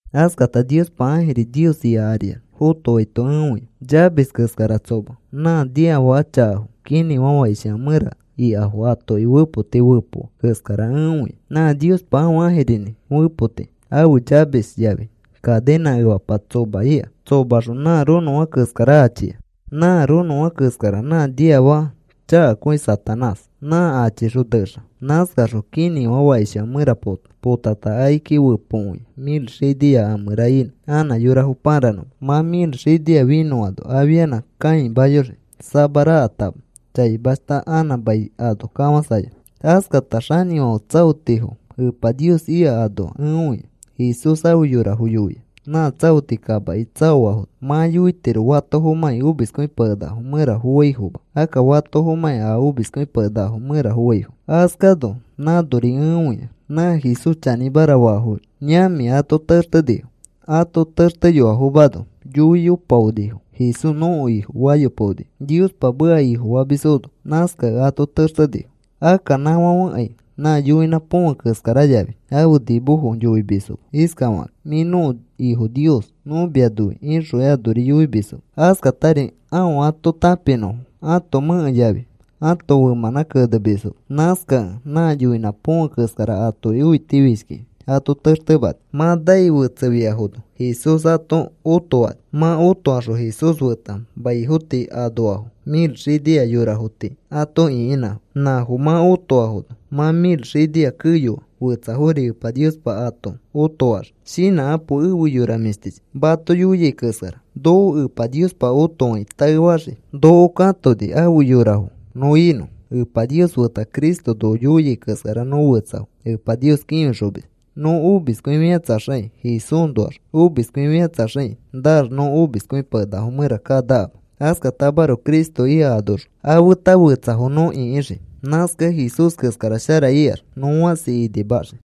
Askata Niospa ãjiri Nios ika ariax fotoaito ẽ õia, chamis keskara tsoma. Nã niafaka chakafo kinĩfã fakishifã mẽra ikafoki atoki fepoti fepoa keskara ẽ õia. Nã Niospa ãfe ãjirinĩ fepotinĩ ãfe chamis yafi kaninã efapa tsoma ika. Tsomaxõ nã ronõfã keskara achia. Nã ronõfã keskara nã niafaka chakakõi Satanás. Nã achixõ nexa. Nãskaxõ kinĩfã fakishifã mẽra pota. Potata akiki fepokõia mil xinia a mẽra inõ anã yorafo pãranõma. Mã mil xinia finõano afianã kãimayoxii samarakatama chaimashta anã mai ano kafãsayonõ. Askata xanĩfãfe tsaotifo Epa Nios ika anoa ẽ õia. Jesús afe yorafo yoia nã tsaoti kamaki tsaoafono, “Mã yoitiro fatofomãkĩ omiskõipakenakafo mẽra foaifoma, akka fatoforimãkĩ a omiskõipakenakafo mẽra foaifo.” Askano nãnoari ẽ õia nã Jesús chanĩmara faafo yamĩ ato textenifo. Ato texteyoafomano yoiyopaonifo: “Jesús nõko Ifo,” fayopaonifo. Niospa meka ifofamisfono, nãskakẽ ato textenifo. Akka nãfãfekai nã yoinã põfe keskara yafi ãfe nimofo yoimisfoma iskafakakĩ: “Mĩ nõko ifo nios. Nõ mia noi,” ixõkai anori yoimisfoma. Askatari aõ ato tãpinõfo ãto mẽke yafi ãto femãnã kenemisfoma. Nãskakẽ nã yoinã põfe keskara atoki õitifishkikĩ ato textemani. Mã nai fetsefiafono Jesús ato otoani. Mã otokaxõ Jesús feta maifo tii anoafo mil xinia yorafo tii ato ĩkinãfo. Nãfo mã otoafono mã mil xinia keyoano fetsafori Epa Niospa ato otoaxii. Shinãkapo efe yora mĩshtichi, mato yoiai keskara. Noko Epa Niospa otofakĩ taefaxii. Noko katoni afe yorafo nõ inõ. Epa Nios feta Cristo noko yoiai keskara nõ fetsafo Epa Nios kĩfixomis. Nõ omiskõifikatsaxakĩ Jesúsnoax omiskõifikatsaxakĩ naax nõ omiskõipakenafo mẽra kanakama. Askatamaroko Cristo ika anoxõ a feta fetsafo nõ ĩkixii. Nãskakẽ Jesús keskara shara ikax nõ fãsi inimaxii.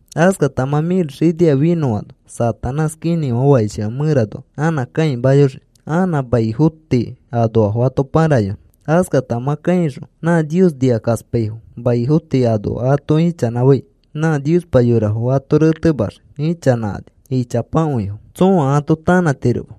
Askata mã mil xinia finõano Satanás kinĩfã fakishifã mẽranoa anã kãimayoxii anã maifo tii anoafo ato pãrayonõ. Askata mã kãixõ nã Nios nikakaspaifo maifo tii anoa ato ichanãfai nã Niospa yorafo ato retemaxii. Ichanãkani ichapakõifo. Nã Nios nikakaspamisfo tsõa ato tanãtiroma.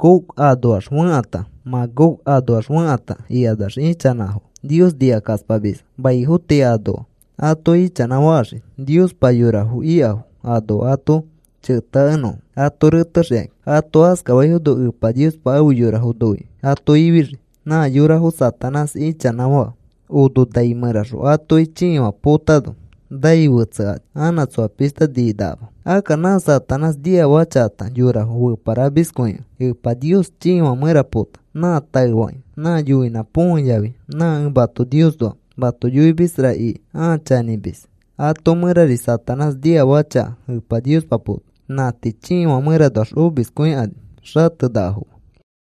Gog anoax fekãta, Magog anoax fekãta, ikanax ichanãfo Nios nikakaspamisfo. Maifo tii anoafo ato ichanãfaxii Niospa yorafo ikafo anoa ato cheteakenõfo ato retexikakĩ. Ato askafaifono Epa Niospa afe yorafo noikĩ ato ifixii. Nã yorafo Satanás ichanãfaa ono nai mẽraxõ atoki chiifã potano nai fetsekani anã tsoa pishta ninakama. Akka nã Satanás niafaka chakata yorafo feparamiskõikẽ Epa Niospa chiifã mẽra pota. Nã taefakĩ nã yoinã põfe yafi nã ẽ mato Niosnoa mato yoimisra iki a chanĩmis ato mẽrari Satanás niafaka chaka Epa Niospa pota. Nã tii chiifã mẽranoax omiskõikani xatenakafoma.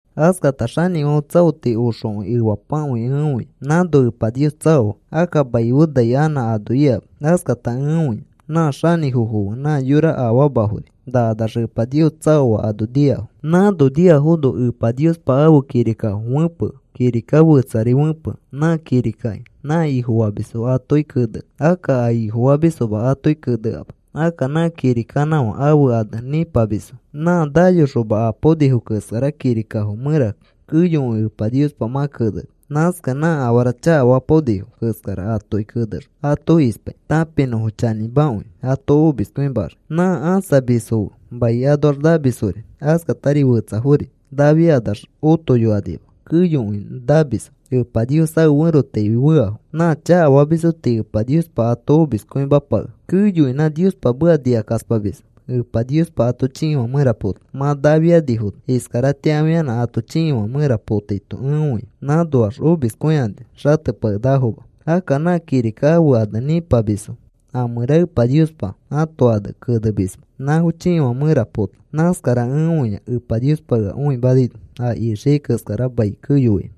Askata xanĩfãfe tsaoti oxokõi efapakõi ẽ õia. Nãno Epa Nios tsaoa. Akka mai fe nai anã ano ikama. Askata ẽ õia nã xanĩfofo fe nã yora afamafori nakanax Epa Nios tsaoa ano niafo. Nãno niafono Epa Niospa ãfe kirikafo fẽpea. Kirika fetsari fẽpea. Nã kirikaki nã Ifofamisfo atoki kenea. Akka a Ifofamisfoma atoki keneama. Akka nã kirikanã ãfe ane Nĩpamisfo. Nã nayoxoma apaonifo keskara kirikafo mẽra keyokõi Epa Niospa mã keneni. Nãskakẽ nã afara chakafapaonifo keskara atoki kenexõ ato ispai tãpinõfo chanĩmakõi ato omiskõimaxii. Nã ãsamisfo fe mai anoax namisfori askatari fetsafori nafiakanax otoyokanima keyokõi namisfo Epa Nios ãfe ferotaifi feafo. Nã chakafamisfo tii Epa Niospa ato omiskõimapakea. Keyokõi nã Niospa meka nikakaspamisfo Epa Niospa ato chiifã mẽra pota. Mã nafianifono iskaratĩa afianã ato chiifã mẽra potaito ẽ õia. Nãnoax omiskõikani xatepakenakafoma. Akka nã kirika ãfe ane “Nĩpamisfo” a mẽra Epa Niospa ãto ane kenemisma, nãfo chiifã mẽra pota. Nãskara ẽ õia Epa Niospa ea õimanaino a ixiai keskara mai keyoaino.